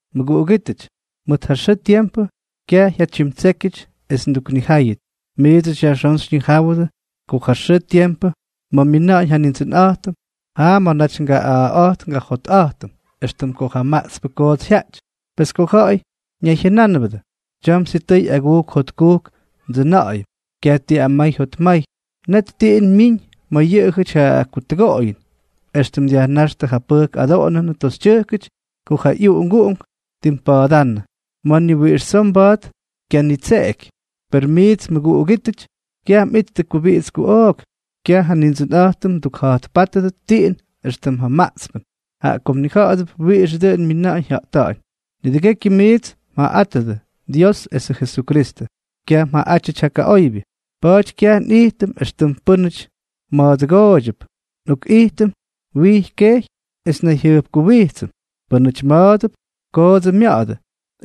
Mʉguꞌugítʉty, mʉt ja xʉʉ tiempʉ, kyaj jyatyimtsékyʉty es nduknijáyʉt. Miidsʉty yajxón xyñijáwʉdʉ ko ja xʉʉ tiempʉ ma̱ myina̱ꞌa̱ñ ja Nindsʉnꞌa̱jtʉm, jaa ma̱ naty ngaꞌa̱a̱ꞌa̱jt ngajotꞌa̱jtʉm, éxtʉm ko ja maꞌtspʉ koots jyaꞌty. Pes ko ja̱ꞌa̱y ñayjyʉnánʉbʉdʉ: “Tyam sitʉy agujk jotkujk ndsʉna̱ꞌa̱yʉm, kyaj ti amay jotmay”, net tiꞌin myiñ ma̱ yʉꞌʉjʉty ja kutʉgoꞌoyʉn, éxtʉm dyajnáxtʉ ja pʉjk adoꞌonʉnʉ toxytyʉjkʉty ko ja ꞌyuꞌunguꞌunk ttimpa̱a̱dánnʉ, ma̱ ni wiꞌix tsoo mba̱a̱t kyanitseꞌeky. Per miits mʉguꞌugítʉty, kyaj mꞌittʉ kubiꞌits kuꞌook, kyaj ja Nindsʉnꞌa̱jtʉm mdukja̱jtpátʉdʉt tiꞌin éxtʉm ja maꞌtspʉn, jaꞌa ko mnija̱ꞌa̱dʉp wiꞌixʉ dʉꞌʉn myina̱ꞌa̱ñ jya̱ꞌta̱ꞌa̱ñ. Nidʉgékyʉty miits mjaꞌaꞌátʉdʉ Dios esʉ Jesukristʉ, kyaj mjaꞌaꞌátyʉty ja kaꞌoybyʉ. Pa̱a̱ty kyaj nꞌijtʉm éxtʉm pʉ́nʉty ma̱a̱dʉgooydyʉp, nꞌokꞌijtʉm wijy kejy es nnayjyʉjkuwijtsʉm. Pʉ́nʉty ma̱a̱dʉp, koodsʉ mya̱ꞌa̱dʉ;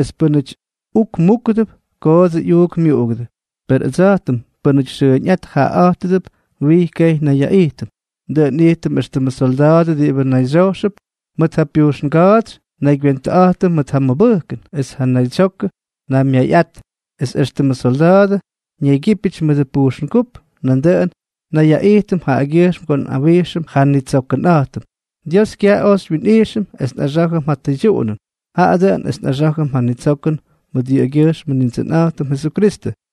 es pʉ́nʉty uk múkʉdʉp, koodsʉ yꞌuuk myuꞌugʉdʉ, per ʉdsa̱jtʉm pʉ́nʉty xʉʉñꞌát jaꞌaꞌa̱jttʉp, wijy kejy nnayyaꞌijtʉm. Dʉꞌʉn nꞌijtʉm éxtʉmʉ solda̱a̱dʉ diꞌibʉ nayxyojxʉp mʉt ja pujxnga̱a̱tsy, naygywentʉꞌa̱jtʉm mʉt ja mʉbʉjkʉn es ja naydsyokʉ naymyayꞌat; es extʉmʉ solda̱a̱dʉ ñaygyípyʉty mʉdʉ pujxngúp, nandʉꞌʉn nnayyaꞌijtʉm jaꞌagyʉjxm ko nꞌawijxʉm ja nnitsokʉnꞌa̱jtʉm. Dios kyaj oj xywyinꞌijxʉm es nꞌaxá̱jʉm ja tʉydyuꞌunʉn, jaꞌa dʉꞌʉn es nꞌaxá̱jʉm ja nitsokʉn mʉt yʉꞌʉgyʉjxmʉ Nindsʉnꞌa̱jtʉm Jesukristʉ.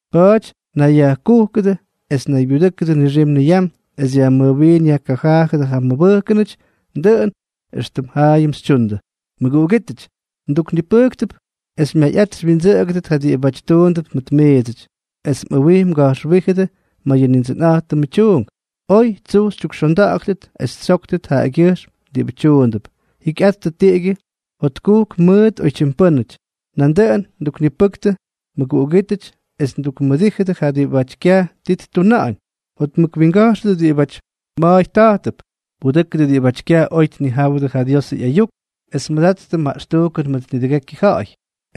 Pa̱a̱ty nayyajkujkʉdʉ, es naybyudʉ́kʉdʉ nixim niyam es yajmʉjwiin yajkajaajʉdʉ ja mmʉbʉjkʉnʉty, dʉꞌʉn éxtʉm jaayʉm xytyundʉ. Mʉguꞌugítʉty, nduknipʉjktʉp es xymyayꞌat xywyindsʉꞌʉgʉdʉt ja diꞌibáty tuundʉp mʉt miidsʉty, es mꞌʉwij mga̱jxwíjʉdʉ ma̱ yʉ Nindsʉnꞌa̱jtʉmʉ tyuunk. Oy tsuj xytyukxonda̱ꞌa̱ktʉt es xytsyóktʉt jaꞌagyʉjxm diꞌibʉ tyuundʉp. Jikyꞌattʉ tiꞌigyʉ jotkujk mʉt oytyim pʉ́nʉty. Nandʉꞌʉn nduknipʉktʉ, mʉguꞌugítʉty, es tukmʉdíjʉdʉ ja diꞌibáty kyaj ti ttuna̱ꞌa̱ñ. Jotmʉk winga̱jxʉdʉ diꞌibáty ma̱a̱y ta̱jtʉp, pudʉ́kʉdʉ diꞌibáty kyaj oy tnijáwʉdʉ ja Diosʉ ꞌyayuk, es mʉdattʉ maꞌxtujkʉn mʉt nidʉgekyʉ ja̱ꞌa̱y.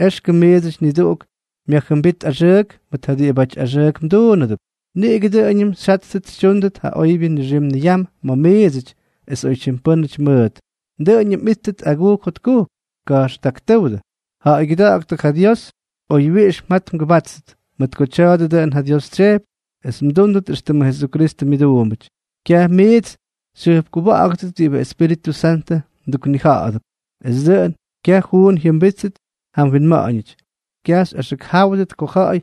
Exkʉm miidsʉty niduꞌuk myajjʉmbít axʉʉk mʉt ja diꞌibáty axʉʉk mduunʉdʉp. Niꞌigʉ dʉꞌʉñʉm xyjáttʉt xytyúndʉt ja oybyʉ nixim niyam ma̱ miidsʉty, es oytyim pʉ́nʉty mʉʉt. Dʉꞌʉñʉm mꞌíttʉt agujk jotkujk. Ka̱jxtaktʉ́wdʉ. Ja̱ꞌa̱ygyʉda̱ꞌa̱ktʉ ja Dios oywyiꞌix mjat mgʉbáttʉt, mʉt ko tya̱a̱dʉ dʉꞌʉn ja Dios tsyejpy es mdúndʉt éxtʉmʉ Jesukristʉ myʉduumbʉty. Kyaj miits xyjʉjpkuwa̱ꞌa̱gʉdʉt diꞌibʉ Espíritʉ Santʉ mduknija̱ꞌa̱dʉp, es dʉꞌʉn kyaj juun jyʉmbíttʉt ja mwinma̱ꞌa̱ñʉty. Kyaj xyꞌaxʉkjáwʉdʉt ko ja̱ꞌa̱y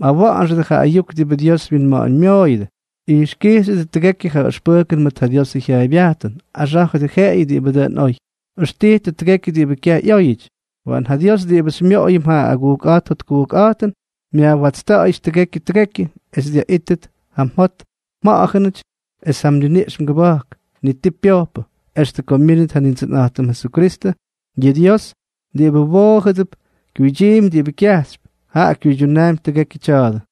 mꞌawa̱ꞌa̱nxʉdʉ ja ayuk diꞌibʉ Dios winma̱ꞌa̱ñmyooyʉdʉ. Ijxkijxyʉdʉ tʉgekyʉ ja ʉxpʉjkʉn mʉt ja Diosʉ jyaaybyajtʉn. Axá̱jʉdʉ jeꞌeyʉ diꞌibʉ dʉn oy. Ʉxtijtʉ tʉgekyʉ diꞌibʉ kyaj ꞌyóyʉty. Waꞌan ja Dios, diꞌibʉ xymyoꞌoyʉm ja agujkꞌa̱jt jotkujkꞌa̱jtʉn, myajwatsta̱ꞌa̱yʉty tʉgekyʉ tʉgekyʉ, es dyaꞌítʉt ja mjot, mꞌanmʉja̱ꞌa̱n esʉ mniniꞌx mgʉba̱jk, ni ti pyojpʉ, extʉ ko myínʉt ja Nindsʉnꞌa̱jtʉm Jesukristʉ. Yʉ Dios diꞌibʉ mwoojʉdʉp, kyuydyiimpy diꞌibʉ kyajxypy, jaꞌa kyuydyunaampy tʉgekyʉ tya̱a̱dʉ.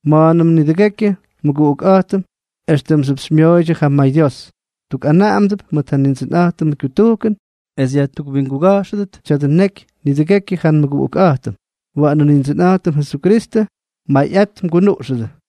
Mʉnandʉ nidʉgekyʉ nmʉguꞌukꞌa̱jtʉm éxtʉmxyʉp xymyoꞌoydyʉ ja mayDios. Ndukꞌanaꞌamdʉp mʉt ja Nindsʉnꞌa̱jtʉmʉ kyutujkʉn, es yajtukwinguga̱jxʉdʉt tya̱dʉ neky nidʉgekyʉ ja nmʉguꞌukꞌa̱jtʉm. Waꞌanʉ Nindsʉnꞌa̱jtʉm Jesukristʉ mmayꞌat mgunuꞌxʉdʉ.